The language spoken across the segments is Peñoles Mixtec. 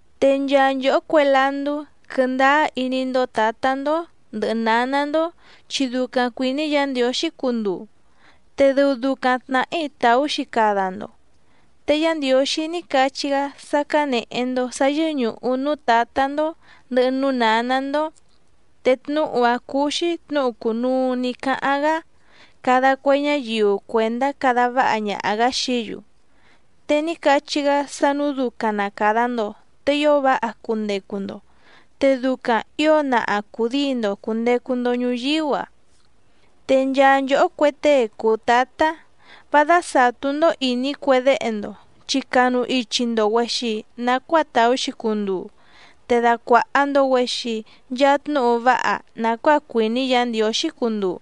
Te nchaa nchòhó cue landú, quɨndáá iní‑ndó tǎtá‑ndó ndɨ̀hɨ náná‑ndó chi ducaⁿ cuìní Yǎ Ndiǒxí cunduu, te dɨu ducaⁿ tnàhí tàú‑xi cada‑ndo. Te Yá Ndiǒxí ní cachí‑gá sá cánèhe‑ndo sá yɨ́ñùhu núú tǎtá‑ndó ndɨ̀hɨ núú nǎná‑ndó. Te tnúhu‑áⁿ cúú‑xí tnǔhu cùnuu ní cáháⁿ‑gá cada cue ñáyiu cuèndá cada váha ñaha‑gǎ xií‑yu. Te ní cachí‑gá sá nǔu ducaⁿ na càda‑ndo te ío váha cundecu‑ndo, te ducaⁿ ǐo naha cùdíi‑ndo cùndecu‑ndo ñuyíú‑a. Te nchaa nchòhó cue tée cùu tátá, vá dásàtú‑ndó ìní cue déhe‑ndo chi canu ichi‑ndo‑güèxi nacuáa tàú‑xi cunduu, te dacuàha‑ndo‑güexi nchaa tnúhu váha nàcuáa cuìní Yǎ Ndiǒxí cunduu.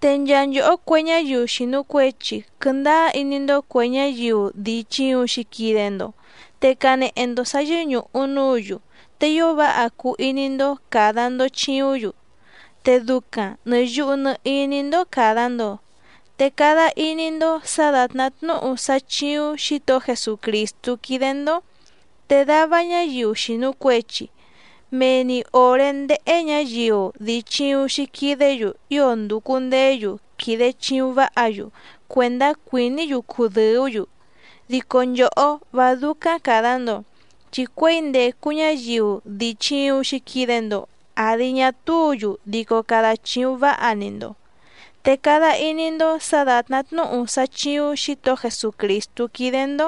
Te nchaa nchòhó cue ñáyiu xìnu cuechi, quɨndáá iní‑ndó cuè ñáyiu dii chìuⁿ‑xi quide‑ndo, te canehe‑ndo sǎ yɨ́ñùhu núǔ‑yu, te ío váha cuu iní‑ndó càda‑ndo chiúⁿ‑yu, te ducaⁿ nɨ̀ yuhu nɨ iní‑ndó càda‑ndo. Te cada iní‑ndó sǎ dàtná tnúhu sá chíúⁿ Xǐtohó Jesucrìstú quídé‑ndó. Te dava ñáyiu xìnu cuechi, mee‑ni òré ndéhé ñǎyiu dii chìuⁿ‑xi quidé‑yu ío ndùcu ndeé‑yu quìde chiuⁿ váha‑yu cuèndá cuìní‑yu cudɨ̀ú‑yu. Dico nchòhó vá dúcáⁿ càda‑ndo, chi cuěi ndècu ñáyiu dii chìuⁿ‑xi quide‑ndo àdi ñá túǔ‑yu dico cada chìuⁿ váha‑ni‑ndo, te cada iní‑ndó sǎ dàtná tnúhu sá chíúⁿ Xǐtohó Jesucrìstú quídé‑ndó,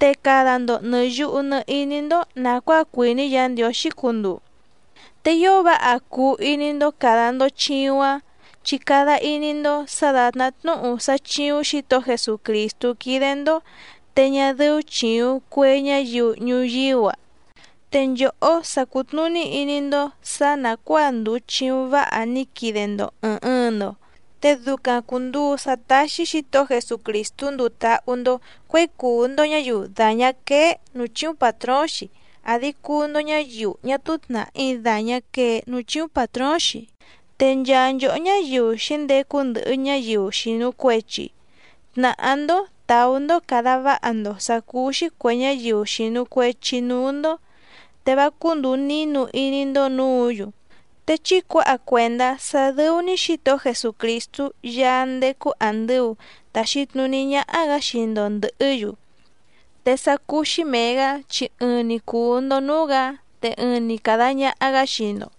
te cada‑ndo nɨ̀ yuhu nɨ iní‑ndó nàcuáa cuìní Yǎ Ndiǒxí cunduu. Te ío váha cuu iní‑ndó càda‑ndo chiuⁿ‑áⁿ, chi cada iní‑ndó sǎ dàtná tnúhu sá chíúⁿ Xǐtohó Jesucrìstú quídé‑ndó te ñá dɨ́ú chìuⁿ cue ñáyiu ñuyíú‑a. Te nchòhó sa cùtnuní iní‑ndó sǎ nàcuáa ndùu chiuⁿ váha ní quide‑ndo ɨ̀ɨⁿ ɨɨⁿ‑ndo, te ducaⁿ cùnduu sá táxí Xǐtohó Jesucrìstú nduu táhú‑ndó cuěi cùu‑ndo ñáyiu dàñá quéé nǔú chíúⁿ pàtróóⁿ‑xi àdi cuu‑ndo ñáyiu ñá túú tnàhí dàñá quee núú chíúⁿ pàtróóⁿ‑xi. Te nchaa nchòhó ñáyiu xǐndecu ndɨhɨ ñáyiu xìnu cuechi, tnàhá‑ndó tàú‑ndó càda váha‑ndo sǎ cúú‑xí cuè ñáyiu xìnu cuechi núú‑ndó, te vá cúndùu nínu iní‑ndó nǔǔ‑yu, te chí cuǎha cuèndá sá dɨ́ú‑ní Xǐtohó Jesucrìstú Yaá ndécú àndɨu taxi tnuní ñáhá‑gǎ xii‑ndo ndɨ̀hɨ́‑yu, te sá cúú‑xí mèe‑gá chi ɨɨⁿ‑ni cùu‑ndo núú‑gǎ, te ɨɨⁿ‑ni càda ñaha‑gá xii‑ndo.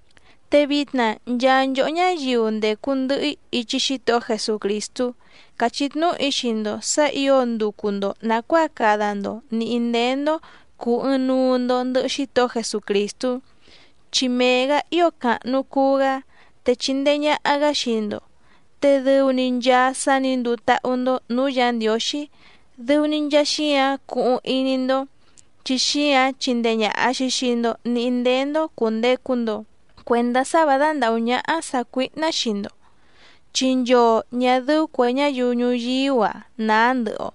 Te vitna nchaa nchòhó ñáyiu ndècu ndɨhɨ‑í ichi Xítohó Jesucrìstú càchí tnúhu‑í xii‑ndo sǎ ǐo nducu‑ndo nàcuáa cada‑ndo nǐhí ndéé‑ndó cùu ɨɨⁿnuu‑ndo ndɨhɨ Xítohó Jesucrìstú, chi mee‑gǎ ío càhnu cuu‑gá, te chindee ñàha‑gá xii‑ndo. Te dɨu‑ni nchaa sá nǐ nduu táhú‑ndó nǔú Yǎ Ndiǒxí dɨu‑ni nchaa xíǎⁿ cuhuⁿ iní‑ndó, chi xíǎⁿ chindee ñàha‑xi xii‑ndo níhí ndéé‑ndó cùndecu‑ndo cuendá sá vǎ dándàhú ñáhá sàcuíhná xii‑ndo. Chi nchoo ñà dɨ́ú cuè ñáyiu ñuyíú‑a nàá ndɨhɨ‑o,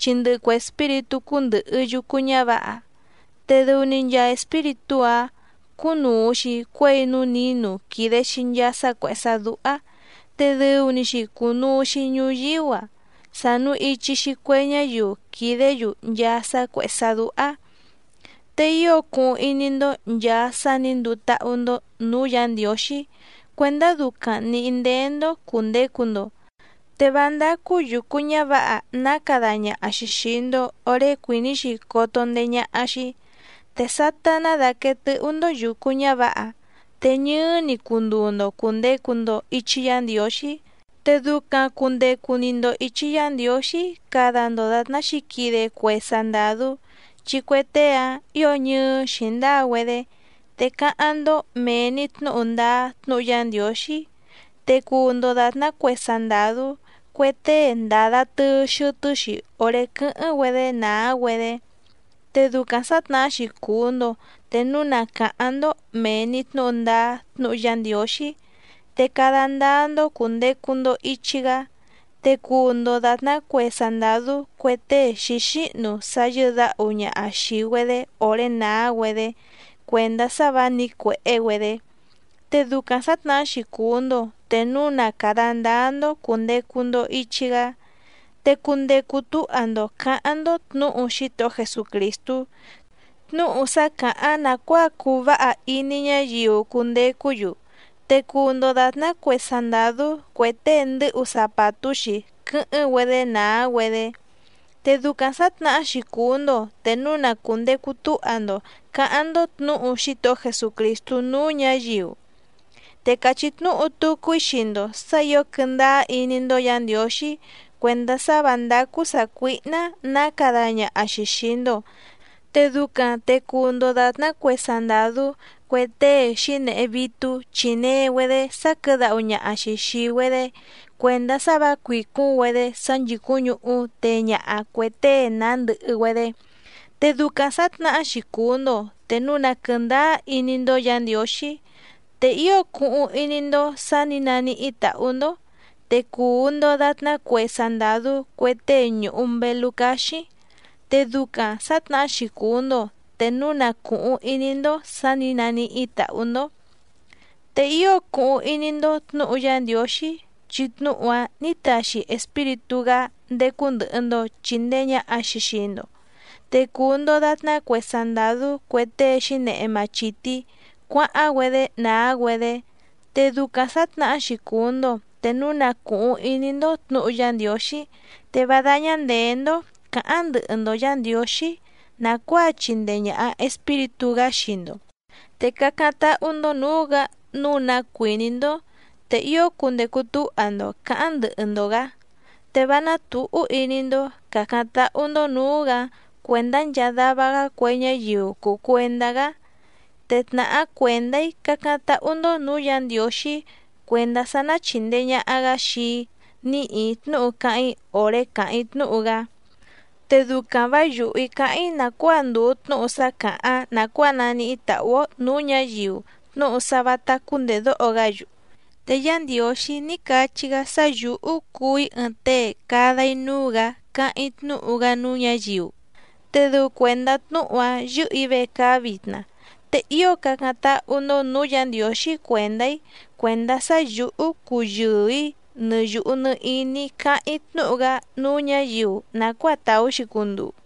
chi ndɨhɨ cue espíritú cúndɨ̀hɨ yucu ñávǎha, te dɨu‑ni nchaa espíritú‑áⁿ cúnùu‑xi cuéi núú nǐnu quìde‑xi nchaa sá cuèhé sá dúhá, te dɨu‑ni‑xi cùnuu‑xi ñuyíú‑a sànu ichi‑xi cue ñáyiu quìdé‑yu nchaa sá cuèhé sá dúhá. Te ío cuhuⁿ iní‑ndó nchàa sá nǐ nduu táhú‑ndó nǔú Yǎ Ndiǒxí cuèndá ducaⁿ nǐhí ndéé‑ndó cùndecu‑ndo, te vá ndácú yùcu ñávǎha ná cada ñaha‑xi xìi‑ndo oré cuìní‑xi coto ndeé ñáhá‑xí. Te sátá ná dàquee tɨ́hú‑ndó yùcu ñávǎha te ñɨɨ́‑ni cunduu‑ndo cùndecu‑ndo ichi Yá Ndiǒxí. Te ducaⁿ cùndecu‑ni‑ndo ichi Yá Ndiǒxí cada‑ndo dàtná xǐquide cue sandàdú, chi cue tée‑áⁿ ǐo ñɨɨ́ xǐndáa‑güedé. Te cáháⁿ‑ndó mèe‑ni tnúhu ndáá tnúhu Yá Ndiǒxí, te cuu‑ndo dàtná cue sandàdú cue tée ndàda tɨɨ xɨtɨ́‑xi òré quɨ́hɨ́ⁿ‑güedé nàá‑güedé. Te ducaⁿ sǎtnahá‑xi cuu‑ndo te núu na càháⁿ‑ndó mèe‑ni tnúhu ndáá tnúhu Yá Ndiǒxí. Te cada ndáá‑ndó cùndecu‑ndo ichi‑gá, te cuu‑ndo dàtná cue sandàdú cue tée xǐxíhnu sá yɨ́dǎhu ñaha xìi‑güedé òré nàá‑güedé cuèndá sá vǎ nǐcuèhé‑güedé. Te ducaⁿ sǎtnahá‑xi cuu‑ndo te núu na càda ndáá‑ndó cùndecu‑ndo ichi‑gá. Te cundecu túha‑ndo cǎháⁿ‑ndó tnǔhu Xítohó Jesucrìstú, tnúhu sá càháⁿ nàcuáa cuu váha iní ñáyiu cundecú‑yu, te cuu‑ndo dàtná cue sandàdú cue tée ndɨ́hu zapàtú‑xi quɨ́hɨ́ⁿ‑güedé nàá‑güedé. Te ducaⁿ sǎtnahá‑xi cuu‑ndo te núu na cùndecu túha‑ndo cǎháⁿ‑ndó tnǔhu Xítohó Jesucrìstú núú ñǎyiu. Te càchí tnúhu tucu‑í xii‑ndo sǎ ǐo quɨndáá iní‑ndó Yǎ Ndiǒxí cuèndá sá vǎ ndácú sàcuíhná nǎ cada ñaha‑xi xìi‑ndo, te ducaⁿ te cuu‑ndo dàtná cue sandàdú cue tée xǐnehe vítú chínèe‑güedé sáquɨ̌dáhu ñaha‑xi xìi‑güedé cuèndá sá vǎ cuìcúⁿ‑güedé sá nchìcúⁿ ñuhú téé ñàha cue tée nàá ndɨhɨ‑güedé. Te ducaⁿ sǎtnahá‑xi cuu‑ndo te núu na quɨ̀ndáá iní‑ndó Yǎ Ndiǒxí. Te ío cuhuⁿ iní‑ndó sǎ nǐ naníhí tàhú‑ndó, te cuu‑ndo dàtná cue sandàdú cue tée ñùhu mbelú cáxíⁿ. Te ducaⁿ sǎtnahá‑xi cuu‑ndo te núu na cùhuⁿ iní‑ndó sǎ nǐ naníhí tàhú‑ndó. Te ío cuhuⁿ iní‑ndó tnǔhu Yá Ndiǒxí, chi tnúhu‑áⁿ nǐ taxi Espíritú‑gá ndécú ndɨ̀hɨ‑ndo chindee ñaha‑xi xii‑ndo, te cuu‑ndo dàtná cue sandàdú cue tée xǐnehe machìtí cuáháⁿ‑güedé nàá‑güedé. Te ducaⁿ sǎtnahá‑xi cuu‑ndo te núu na cùhuⁿ iní‑ndó tnǔhu Yá Ndiǒxí. Te vá dáñá ndèé‑ndó cǎháⁿ ndɨhɨ‑ndo Yǎ Ndiǒxí nàcuáa chìndee ñaha Espíritú‑gá xii‑ndo, te cácáⁿ táhú‑ndó nǔú‑gǎ nǔu ná cuìní‑ndó, te ío cundecu túha‑ndo cǎháⁿ ndɨhɨ‑ndo‑gǎ, te vá nátùhú iní‑ndó cǎcáⁿ táhú‑ndó nǔú‑gǎ cuèndá nchaa dava‑gá cue ñáyiu cùu cuendá‑gá. Te tnàhá cuèndá‑í cácáⁿ táhú‑ndó nǔú Yǎ Ndiǒxí cuèndá sá ná chìndee ñaha‑gá xii‑í níhì‑í tnúhu cáháⁿ‑í òré càháⁿ‑í tnúhu‑gá, te ducaⁿ vǎ yùhú‑í cáháⁿ‑í nàcuáa ndùu tnúhu sá càháⁿ nàcuáa naníhí tàhú‑ó nǔú ñǎyiu tnúhu sá vǎtá cúndèdóho‑gá‑yu. Te Yá Ndiǒxí ní cachí‑gá sá yǔhú cuu‑í ɨɨⁿ tée cada‑í núú‑gǎ cáháⁿ‑í tnúhu‑gá núú ñǎyiu, te dɨu cuèndá tnúhu‑áⁿ yɨ́hɨ̀‑í vecaá vitna. Te ío cácáⁿ táhú‑ndó nǔú Yǎ Ndiǒxí cuèndá‑í cuèndá sá yǔhú cuyɨɨ‑ǐ nɨ yùhu nɨ iní‑í cáháⁿ‑í tnúhu‑gá núú ñǎyiu nàcuáa tàú‑xi cunduu.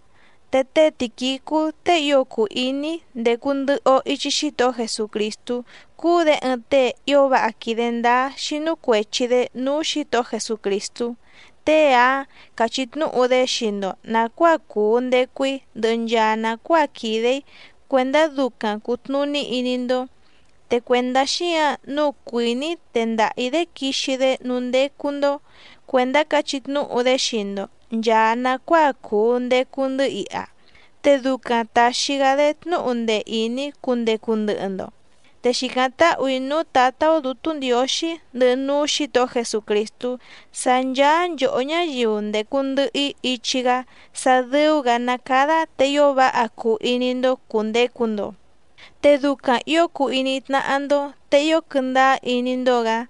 Te té Tìquicú tée ío cùu iní‑í ndécú ndɨ̀hɨ‑o ichi Xítohó Jesucrìstú cúú‑dě ɨɨⁿ tée ío váha quìde ndáá xínú cuèchi‑dé núú Xǐtohó Jesucrìstú, tée‑áⁿ cachí tnúhu‑dé xii‑ndo nàcuáa cùu ndecu‑í ndɨhɨ nchaa nàcuáa quìde‑í cuèndá ducaⁿ cùtnuní iní‑ndó. Te cuèndá xíǎⁿ nǔu cuìní‑í tendaha‑ǐ‑dé quixi‑dé núú ndécú‑ndó cuèndá cachí tnúhu‑dé xii‑ndo nchàa nacuáa cùu ndecu‑ndɨ́ iha, te ducaⁿ tàxi‑gá‑dé tnúhu ndee ìní cundecu ndɨhɨ‑ndo. Te xìcáⁿ táhù‑í núú Tǎtá‑ó Dǔtú Ndiǒxí ndɨhɨ núú Xǐtohó Jesucrìstú sá ncháá nchòhó ñáyiu ndècu ndɨhɨ‑í ichi‑gá sá dɨ̀u‑gá ná cádá te ío váha cuu iní‑ndó cùndecu‑ndo, te ducaⁿ ǐo cuu iní tnáhá‑ndó, te ío quɨndáá iní‑ndó‑gǎ.